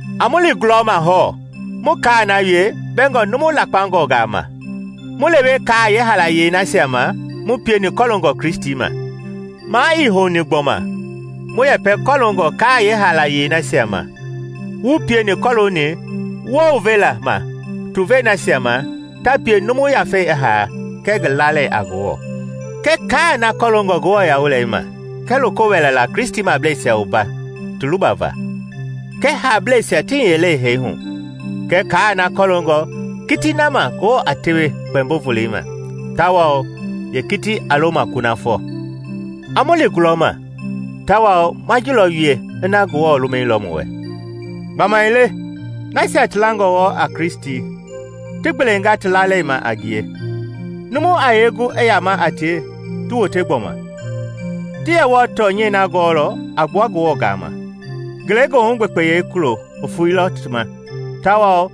A mu li gulɔma, hɔɔ, mu kaa na wie mbɛngɔ numu lakpangɔngaa ma, mu lewe kaa yeehaalayei nasia ma mu pieni kɔloongɔ Kristi ma. Maa ii houni gbɔma mu yɛpɛ kɔlongɔ kaa yeehaalayei nasia ma wu pieni kɔlooni wounvela ma tuvei nasia ma ta pie numu yafei i haa kɛɛ ngi lalei a Ngewɔ; kɛɛ kaa na kɔloongɔ nguɛi ma kɛɛ loko wɛlɛla Kristimableisia wumba ti lubava; kɛɛ haablɛisia ti hiyelei hee hu kɛɛ kaa na kɔlooni kitii na ma Ngewɔ a tewe kpɛmbo-volei ma tawao yeekitii a lo ma kunafɔ. A mu li gulɔma! Tawao ma ji lɔ wie ina Ngewɔ lumɛilɔ mu wɛ. Gbamaile nasia ti langɔ wɔɔ a Kristi ti gbelengaa ti lalei ma a ngie, numu a yee gu i yama a tie ti wote gbɔma? Ti yɛ wɔɔ tɔnyɛi na gɔɔlɔ a gbua Ngewɔ gaama; ngelegoohu gbekpeyɛi kulo i foeilɔ ti ma tawao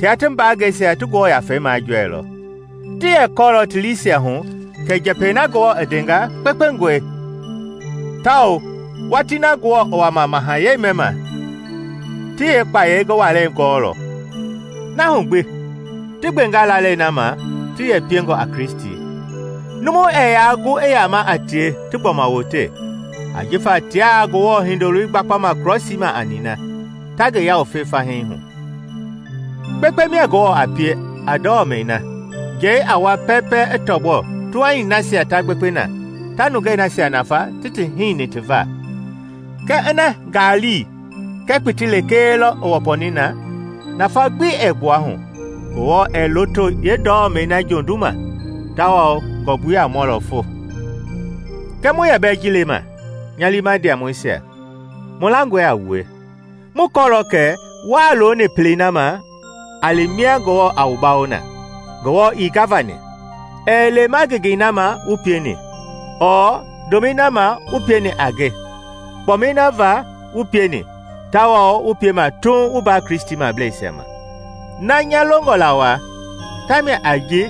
tia ti mbaangɛisia ti Ngewɔ Yafei majɔɛilɔ; ti yɛ kɔɔlɔ ti liisia hu kɛ njɛpɛi na Ngewɔ i ndenga kpekpengɔe tawao watii na Ngewɔ i wama mahayɛi mɛma ti yeekpayei ngi walɛi ngɔɔlɔ. Na hu gbi ti gbengaa lalei na ma ti yɛ piengɔ a Kristi, numu ɛɛ yaa gu i yama a tie ti gbɔma wote, ajifa tiaa Ngewɔ Hindoloi gbakpama krɔsii ma a nina, ta ngi yawufe fahii hu. Kpekpe mia Ngewɔ a pie a ndɔmɛi na njɛi a wua pɛɛpɛ i tɔgbɔ tuhani nasia ta gbekpe na ta nungei nasia nafa ti ti hini ti va. Kɛɛ ina ngaali kɛɛ kpiti lekee lɔ i wɔpɔni na, nafa gbi ɛɛ gbuahu; Ngewɔ ɛɛ loto yeendɔmɛi na jonduma, tawao ngɔmbui a mɔlɔ fo. Kɛɛ mu yɛ bɛɛ ji lema, nya liima ndiamɔisia, mu langɔe a wue. Mu kɔɔlɔ kɛ wuaa looni pelei na ma a li mia Ngewɔ a wu bawo na. Ngewɔ ii gavani. Ɛɛ lema ngengei na ma wu pieni, ɔɔ ndomɛi na wu pieni a ngie kpɔmɛi na va wu pieni tawao wu piema tuuŋ wu mbaa Kristimableisia ma. Na nya longɔ la waa, ta mia a ji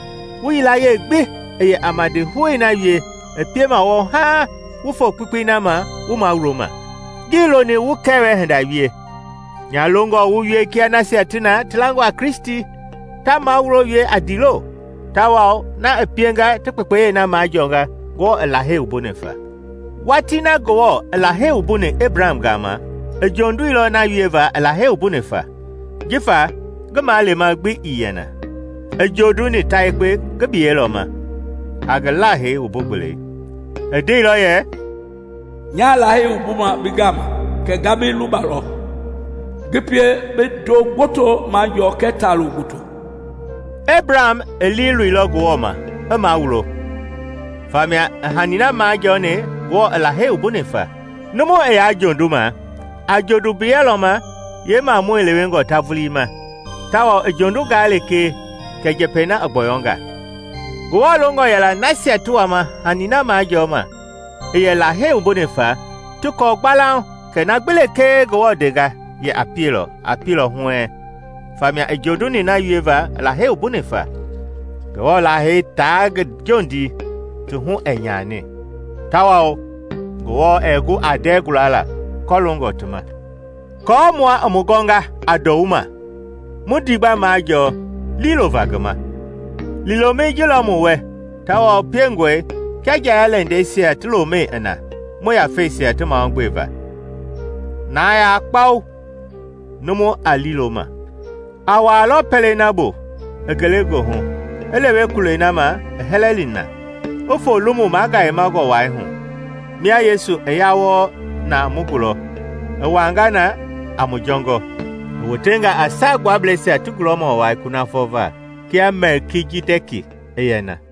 wu yilayee gbi i yɛ a madihou na wie i piema wɔɔ haaŋ wu foo kpekpei na ma wu mawuloma. Ngii loni wu kɛwɛ hinda wie; nya longɔ wu wie kia nasia ti na ti langɔ a Kristi, ta mawulo wie a ndiilo, tawao na i pienga ti kpekpeyei na majɔɔnga Ngewɔ i Lahei wumbuni fa. Watii na Ngewɔ i Lahei wumbuni Ebraham gama, i jonduilɔ na wieva i Lahei wumbuni fa. Jifa ngi malema gbi ii yɛ na, i jonduni ta yekpe ngi biyɛi lɔ ma a ngi Lahei wumbu-gbelei. I ndeilɔ yɛ, “Nyaa Lahei wumbuma bi gama kɛ nga bi lubalɔ, ngi pie bi ndo gboto majɔɔ kɛɛ taa-loo gboto.” Ebraham i liiloilɔ Ngewɔ ma i mawulo, famia i hani na majɔɔni Ngewɔ i Lahei wumbuni fa. Numu i yaa jonduma, a jondu mbiyɛ lɔ ma yeemamɔi lewengɔ ta vulii ma, tawao i jondungaa lekee kɛ njɛpɛi na i gbɔyɔnga. Ngewɔ longɔ yɛla nasia ti wama hani na majɔɔma i yɛ Lahei wumbuni fa ti kɔɔ gbalauŋ kɛ na gbi lekee Ngewɔ ndengaa yɛ a pielɔ, a pielɔ huɛɛŋ; famia i jonduni na wieva i Lahei wumbuni fa. Ngewɔ Lahei taa ngi jondii ti hu ɛɛ nyani tawao Ngewɔ ɛɛ gu aa ndɛɛ guala kɔloongɔ ti ma. Aako mua i mu gɔnga a ndɔwuma, mu ndiigba majɔɔ liilova ngi ma. Liilomɛi ji lɔ mu wɛ tawao piengɔe kia nja-ya-lɛndɛisia ti lomɛi i na mu yafeisia ti mahugbe va, na yaa kpau, numu a liilo ma. A wuaalɔ pɛlei na bu i ngelegoohu i lewe kulɛi na ma i hɛlɛni na, i foo lomu magayemangɔ wai hu, mia Yesu i ya wɔɔ na mu gulɔ, i wuaanga na a mu jɔngɔ. I wotenga a Saagbuablɛisia ti gulɔmɔ wai kunafɔ va, kia Mɛlkijidɛki i yɛ na.